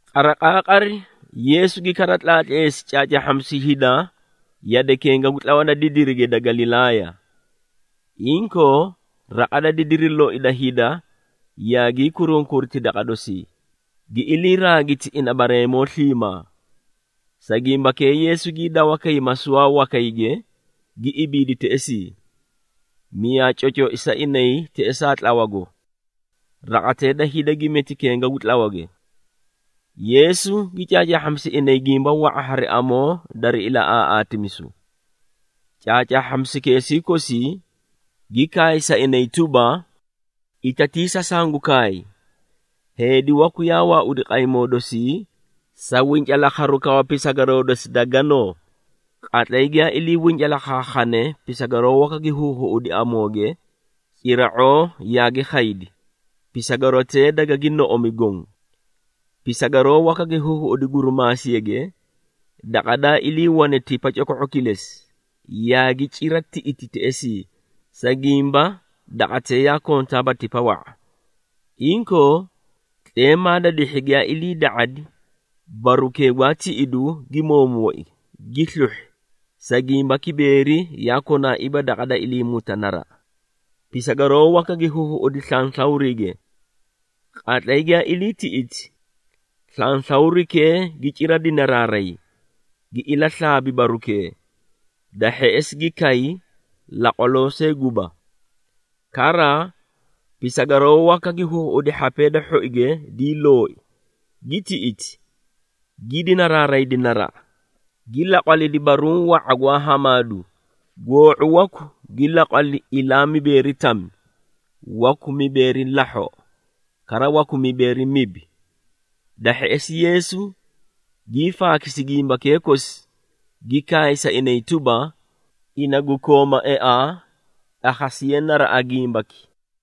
Qariqaaqari, Yeesu gi kara tlaatleesi caacaahhamisu hida yade kenga gu tlawa da didirige da Galilaaya. Inkoo, raqa da didiri loi da hida yaagii kurunkuriti daqa dosii, gi ilii raagiti ina bareemoo sliimaa. Sa gimbakee Yeesu gii dawa kay masuwaa wakayge, gi ibiidi teꞌesii, miyaa cocoi sa inay teꞌesaa tlawago. Raqatee da hida gi meti kenga gu tlawage. Yeesu gi caacaahhamisi inay gimba wa⁄a hari amoo dari ilaꞌaaꞌaatimisu. Caacaahhamisukeesii kosii, gi kaay sa inay tuba, “Itatiisa sangu kaay! Heedi waku yaa waaudi qaymoo dosii sa wincalaakharu kawa pisagaroo dosi da ganoo. Qatlay giyaa ilii wincalaakhaakhane, pisagaroo waka gi huhuꞌudi amooge, cira⁄oo yaagi khaydi, pisagarotee dagagi noꞌomi goõ. Pisagaroo waka gi huhuꞌudi gurumaasiyage, daqa daa iliiwane tipa coko⁄o kilesi, yaagi cira tiꞌiti teꞌesii, sa gimba daqatee yaa kontaaba tipa wa⁄a. Inkoo, tleemaa da dihhi giyaa iliida⁄adi, barukee gwaa tiꞌidu gi moomooi, gi sluhhi, sa gimba kibeeri yaa konaaiiba daqa da iliimuta naraꞌa. Pisagaroo waka gi huhuꞌudi slanslawriige. Qatlay giyaa ilii tiꞌiti, slanslawrikee gi cira dinaraaray, gi ilaslaabi barukee, da hheꞌesi gi kay, laqwaloo see guba. Kara pisagaroo waka gi huhuꞌudi hhapee da hhoige dii looi, gi tiꞌiti, gi dinaraaraydi naraꞌa, gi laqwalidi baruũ wa⁄a gwaa hamaadu, goo⁄u waku gi laqwali ilaa mibeeri tami, waku mibeeri lahhoꞌo, kara waku mibeeri mibi.” Da hheꞌesi Yeesu gii faakisi gimbakee kosi, gi kaay sa inay tuba, “Ina gu kooma eaa, akhasiye naraꞌa gimbaki.”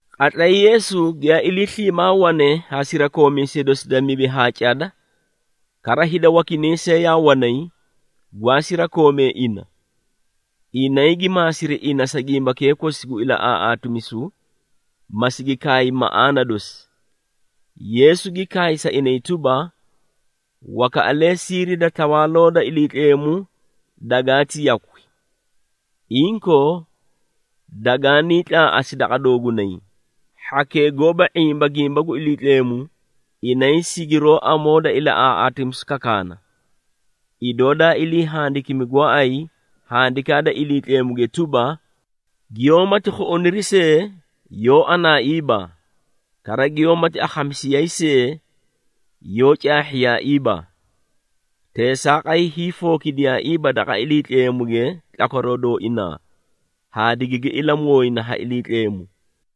Qatlay Yeesu giyaa ilii sliimaa wane haa sirakoomiisee dosi da mibi haa cada, kara hida wakinay see yaa wanay, gwaa sirakoomee ina, inay gi maasiri ina sa gimbakee kosi gu ilaꞌaaꞌaatimisu, ma sigi kaay maꞌaana dosi. Yeesu gi kaay sa inay tuba, “Wakaꞌalee siiri da Tawaaloo da Iliitleemu dagaati yakwi. Inkoo dagaanii tlaaꞌasi daqa doogunay. Hhakee goóba ⁄imba gimba gu Iliitleemu, inay sigiroó amoo da ilaꞌaaꞌaatimisu kakaana, idoo daa ilii handikimi gooay Handikaa da Iliitleemuge tuba, ‘Giyoómati khuꞌuniri see, yoó anaiiba, kara giyoómati akhamisiyayi see, yoó caahhiyaaiiba! Teesaaqay hiifookidiyaaiiba daqa Iliitleemuge tlakwaroo dooinaa, haa digigi ilamooyina ha Iliitleemu.’”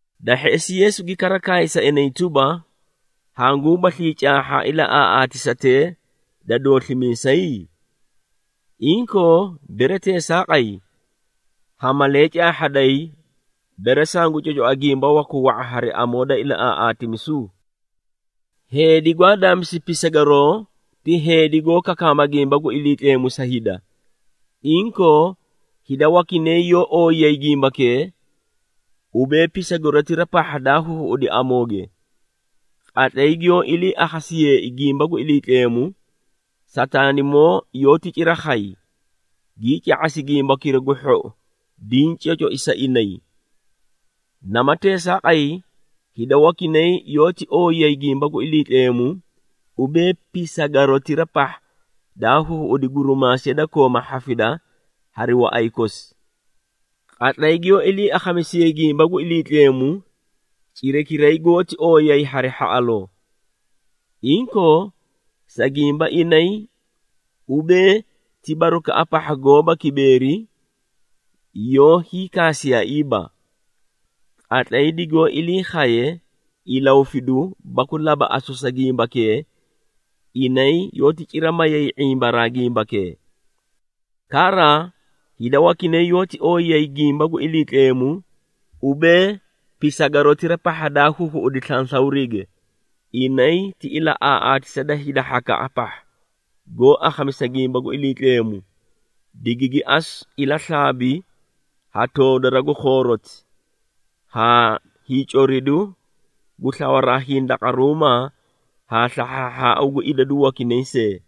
Da hheꞌesi Yeesu gi kara kaay sa inay tuba, “Hanguubaslii caahha ilaꞌaaꞌaatisatee da dooslimiisay? Inkoo, bere teesaaqay, ha malee caahhaday, bere sangu cocoa gimba waku wa⁄a hari amoo da ilaꞌaaꞌaatimisu? Heedi gwaa daamisu pisagaroo ti heedi goó kakaama gimba gu Iliitleemu sa hida. Inkoo, hida wakinay yoó ooyiyayi gimbakee, ubee pisagarotira pahha daa huhuꞌudi amooge. Qatlay giyoo ilii akhasiyeei gimba gu Iliitleemu, Sataanimoo yoóti cira khay, gii ca⁄asi gimbakira gu hhou diĩ cocoi sa inay. Nama teesaaqay, hida wakinay yoóti ooyiyayi gimba gu Iliitleemu, ubee pisagarotira pahha daa huhuꞌudi gurimaasiya da kooma hhafida hari waꞌay kosi. Qatlay giyoo ilii akhamisiyee gimba gu Iliitleemu, cirakiray goóti ooyiyayi hari hhaꞌaloo. Inkoo, sa gimba inay, ubee ti barukaꞌa pahha gooba kibeeri, yoó hiikaasiyaaiiba. Qatlay digoó ilii khaye ilahufidu baku labaꞌasu sa gimbakee, inay yoóti cira mayay ⁄imbaraa gimbakee. Kara hida wakinay yoóti ooyiyayi gimba gu Iliitleemu, ubee pisagarotira pahha daa huhuꞌudi slanslawriige. Inay ti ilaꞌaaꞌatisa da hida hhakaꞌa pahha, goó akhamisa gimba gu Iliitleemu, digigi asu ilaslaabi ha toodara gu khooroti, haa hiicoridu gu slawaraa hindaqaruumaa haa slahhaahhaau gu idadu wakinay see.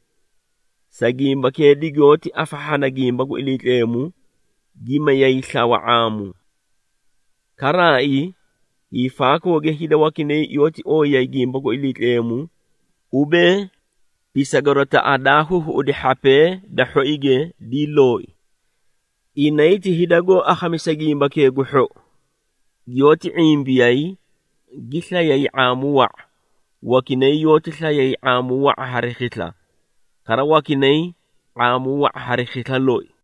Sa gimbakee digoóti afahhana gimba gu Iliitleemu, gi mayay slawa ⁄aamu. Karaai hiifaakooge hida wakinay yoóti ooyiyayi gimba gu Iliitleemu, ubee, pisagarotaꞌa daa huhuꞌudi hhapee da hhoige dii looi. Inay ti hida goó akhamisa gimbakee gu hhou, giyoóti ⁄imbiyay, gi slayay ⁄aamu wa⁄a, wakinay yoóti slayay ⁄aamu wa⁄a hari khisla, kara wakinay ⁄aamu wa⁄a hari khisla loi.”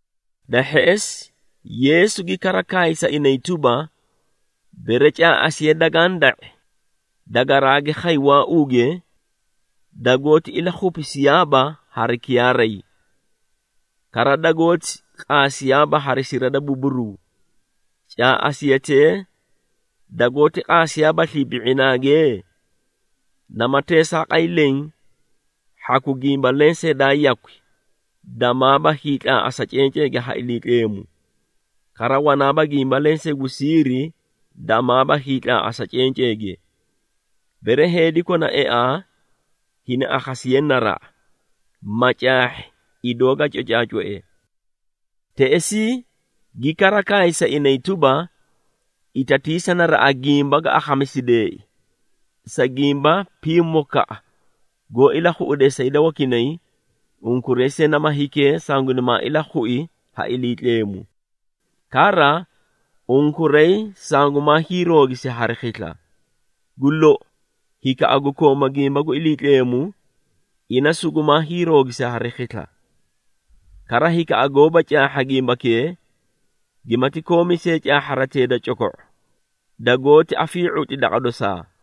Da hheꞌesi Yeesu gi kara kaay sa inay tuba, “Bere caaꞌasiya dagaã da⁄i, dagaraagi khay waauuge, dagoóti ilakhupisiyaaba hari kiyaaray. Kara dagoóti qaasiyaaba hari sira da buburuu. Caaꞌasiyatee dagoóti qaasiyaabaslii bi⁄inaage? Nama teesaaqay leẽ, hhaku gimba lensee daa yakwi, damaaba hiitlaaꞌasa cenceege ha Iliitleemu, kara wanaaba gimba lensee gu siiri damaaba hiitlaaꞌasa cenceege. Bere heedi kona eaa, hini akhasiye naraꞌa, ma caahhi idoo ga cocaacoe.” Teꞌesii gi kara kaay sa inay tuba, “Itatiisa naraꞌa gimba ga akhamisideei, sa gimba pimokaꞌa goó ilakhuꞌudee sa hida wakinay, unkuray see nama hikee, sangunimaa ilakhui ha Iliitleemu! Kara unkuray sangumaa hiiroogisi hari khisla. Gu lou, hikaꞌa gu kooma gimba gu Iliitleemu, ina sugumaa hiiroogisi hari khisla. Kara hikaꞌa goóba caahha gimbakee, gimati koomi see caahharatee da coko⁄o, dagoóti afii⁄utli daqa dosaa.”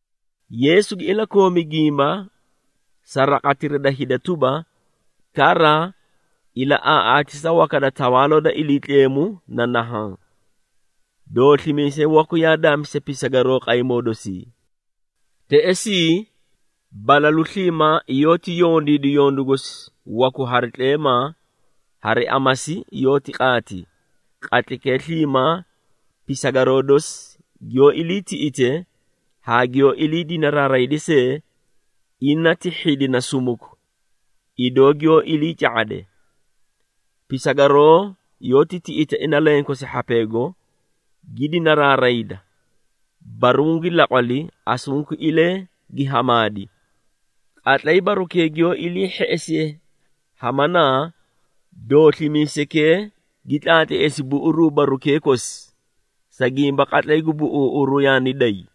Yeesu gi ilakoomi gimba sa raqatira da hida tuba, “Kara ilaꞌaaꞌaatisa waka da Tawaaloo da Iliitleemu na nahaã: Dooslimiisay waku yaa daamisi pisagaroo qaymoo dosii. Teꞌesii balalu sliimaa yoóti yondiidi yondu gosi waku hari tleemaa, hari amasi yoóti qaati, qatlaykee sliimaa pisagaroo dosi giyoó iliitiꞌite, haa giyoó ilii dinaraarayde see, ina ti hhidina sumuku, idoo giyoó ilii ca⁄ade. Pisagaroo yoóti tiꞌita ina lenkosi hhapeego, gi dinaraarayda, baruũ gi laqwali, asunkuilee gi hamaadi. Qatlay barukee giyoo ilii hheꞌesiye hamanaa, dooslimiisaykee gi tlaatleesi buꞌuruu barukee kosi, sa gimba qatlay gu buꞌuuꞌuru yaani day.”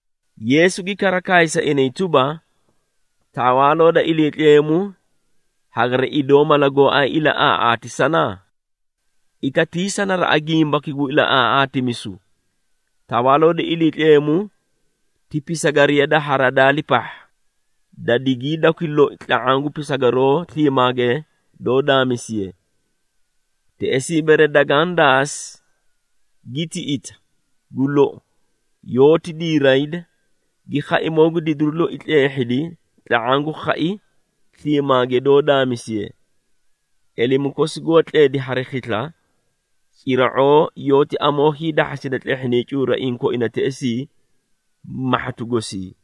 Yeesu gi kara kaay sa inay tuba, “Tawaaloo da Iliitleemu hagari idoo mala gooay ilaꞌaaꞌaatisana? Itatiisa naraꞌa gimbaki gu ilaꞌaaꞌaatimisu! Tawaaloo da Iliitleemu ti pisagariya da haradaali pahha, da digiidakwi loi tla⁄aã gu pisagaroo sliimaage doó daamisiye. Teꞌesii bere dagaã daasi, gi tiꞌita, gu lou yoóti diirayda, gi khaimoo gu didiru loi tleehhidi tla⁄aã gu khai sliimaage doó daamisiye. Elemu kosi goó tledi hari khisla, cira⁄oo yoóti amoo hiidahhasida tleehhinay cuuraiĩ koina teꞌesii, mahhatu gosii.”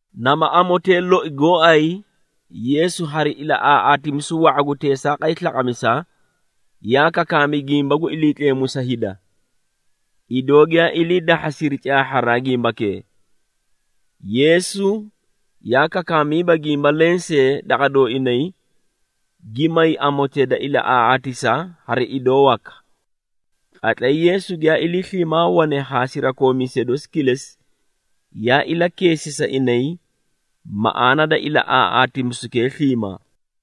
Nama amotee loi gooay, Yeesu hari ilaꞌaaꞌaatimisu wa⁄a gu teesaaqay slaqamisa, yaa kakaami gimba gu Iliitleemu sa hida, idoo giyaa ilii dahhasiri caahharaa gimbakee. Yeesu yaa kakaamiiba gimba lensee daqa dooinay, gi may amotee da ilaꞌaaꞌaatisa haa idoo waka. Qatlay Yeesu giyaa ilii sliimaa wane haa sirakoomiisee dosi kilesi, yaa ilakeesi sa inay maꞌaana da ilaꞌaaꞌaatimisukee sliimaa.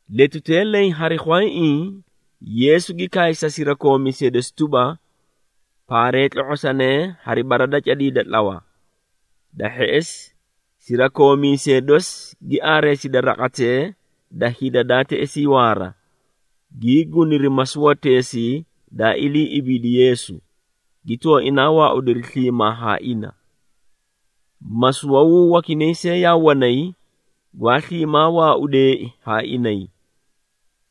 Letutee leẽ hari khwayaiĩ, Yeesu gi kaay sa sirakoomiisee dosi tuba, “Paaree tlo⁄osanee hari bara da cadii da tlawa.” Da hheꞌesi, sirakoomiisee dosi gi aareesidi raqatee da hida daa teꞌesii waara, gii guniri masuwateesii daa ilii ibiidi Yeesu, gi tooinaa waaudiri sliimaa haa ina. Masuwawuu wakinay see yaa wanay, gwaa sliimaa waaudeei haa inay.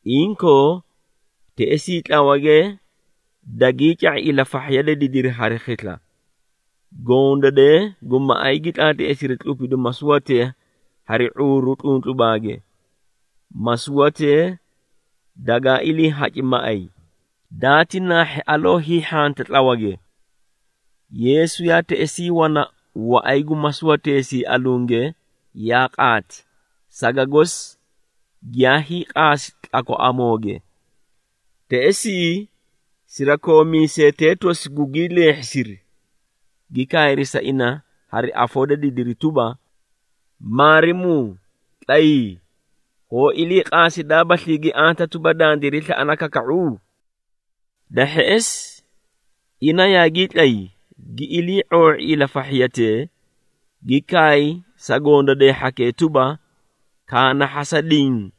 Inkoo, teꞌesii tlawage daagii ca⁄i ilafahhiya da didiri hari khisla, gondadee gu maꞌay gi tlaatleesiri tlupidu masuwatee hari ⁄uuru tluntlubaage, masuwatee dagaa iliihaci maꞌay, daati naahhi aloo hiihhanta tlawage. Yeesu yaa teꞌesii wana waꞌay gu masuwateesii alunge, yaa qaati, saga gosi giyaa hiiqaasi tlakwaꞌamooge. Teꞌesii sirakoomiisetee tosi gugii leehhisiri, gi kaayri sa ina hari afoo da didiri tuba, “Maarimuu, tlayii! Hoo iliiqaasidaabaslii gi anta tuba, dandiray slaꞌana kaka⁄u?” Da hheꞌesi ina yaagii tlay, gi ilii⁄oo⁄i ilafahhiyatee, gi kaay sa gondadee hhakee tuba, “Kaanahhasa diĩ,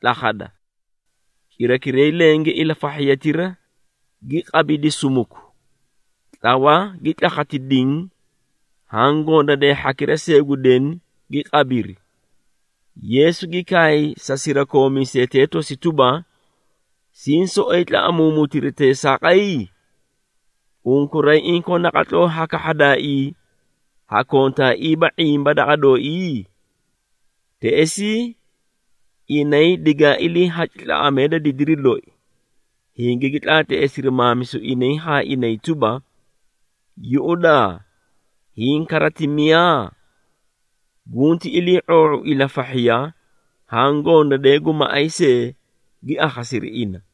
tlakhada!” Cirakiray lenge ilafahhiyatira gi qabidi sumuku, tlawa gi tlakhati diĩ haã gondadee hhakira see gu deni gi qabiri. Yeesu gi kaay sa sirakoomiisetee tosi tuba, “Siĩ soꞌoyi tlaꞌamuumutiri teesaaqay? Unkuray inkoo naqatloo ha kahhadaaii, hakontaaiiba ⁄imba daqa dooii?” Teꞌesii inay digaa iliihaci tlaꞌamee da didiri loi, hingigi tlaatleesiri maamisu inay haa inay tuba, “Yuꞌudaa, hiĩ kara ti miyaa? Gunti ilii⁄oo⁄u ilafahhiya haã gondadee gu maꞌay see, gi akhasiri ina.”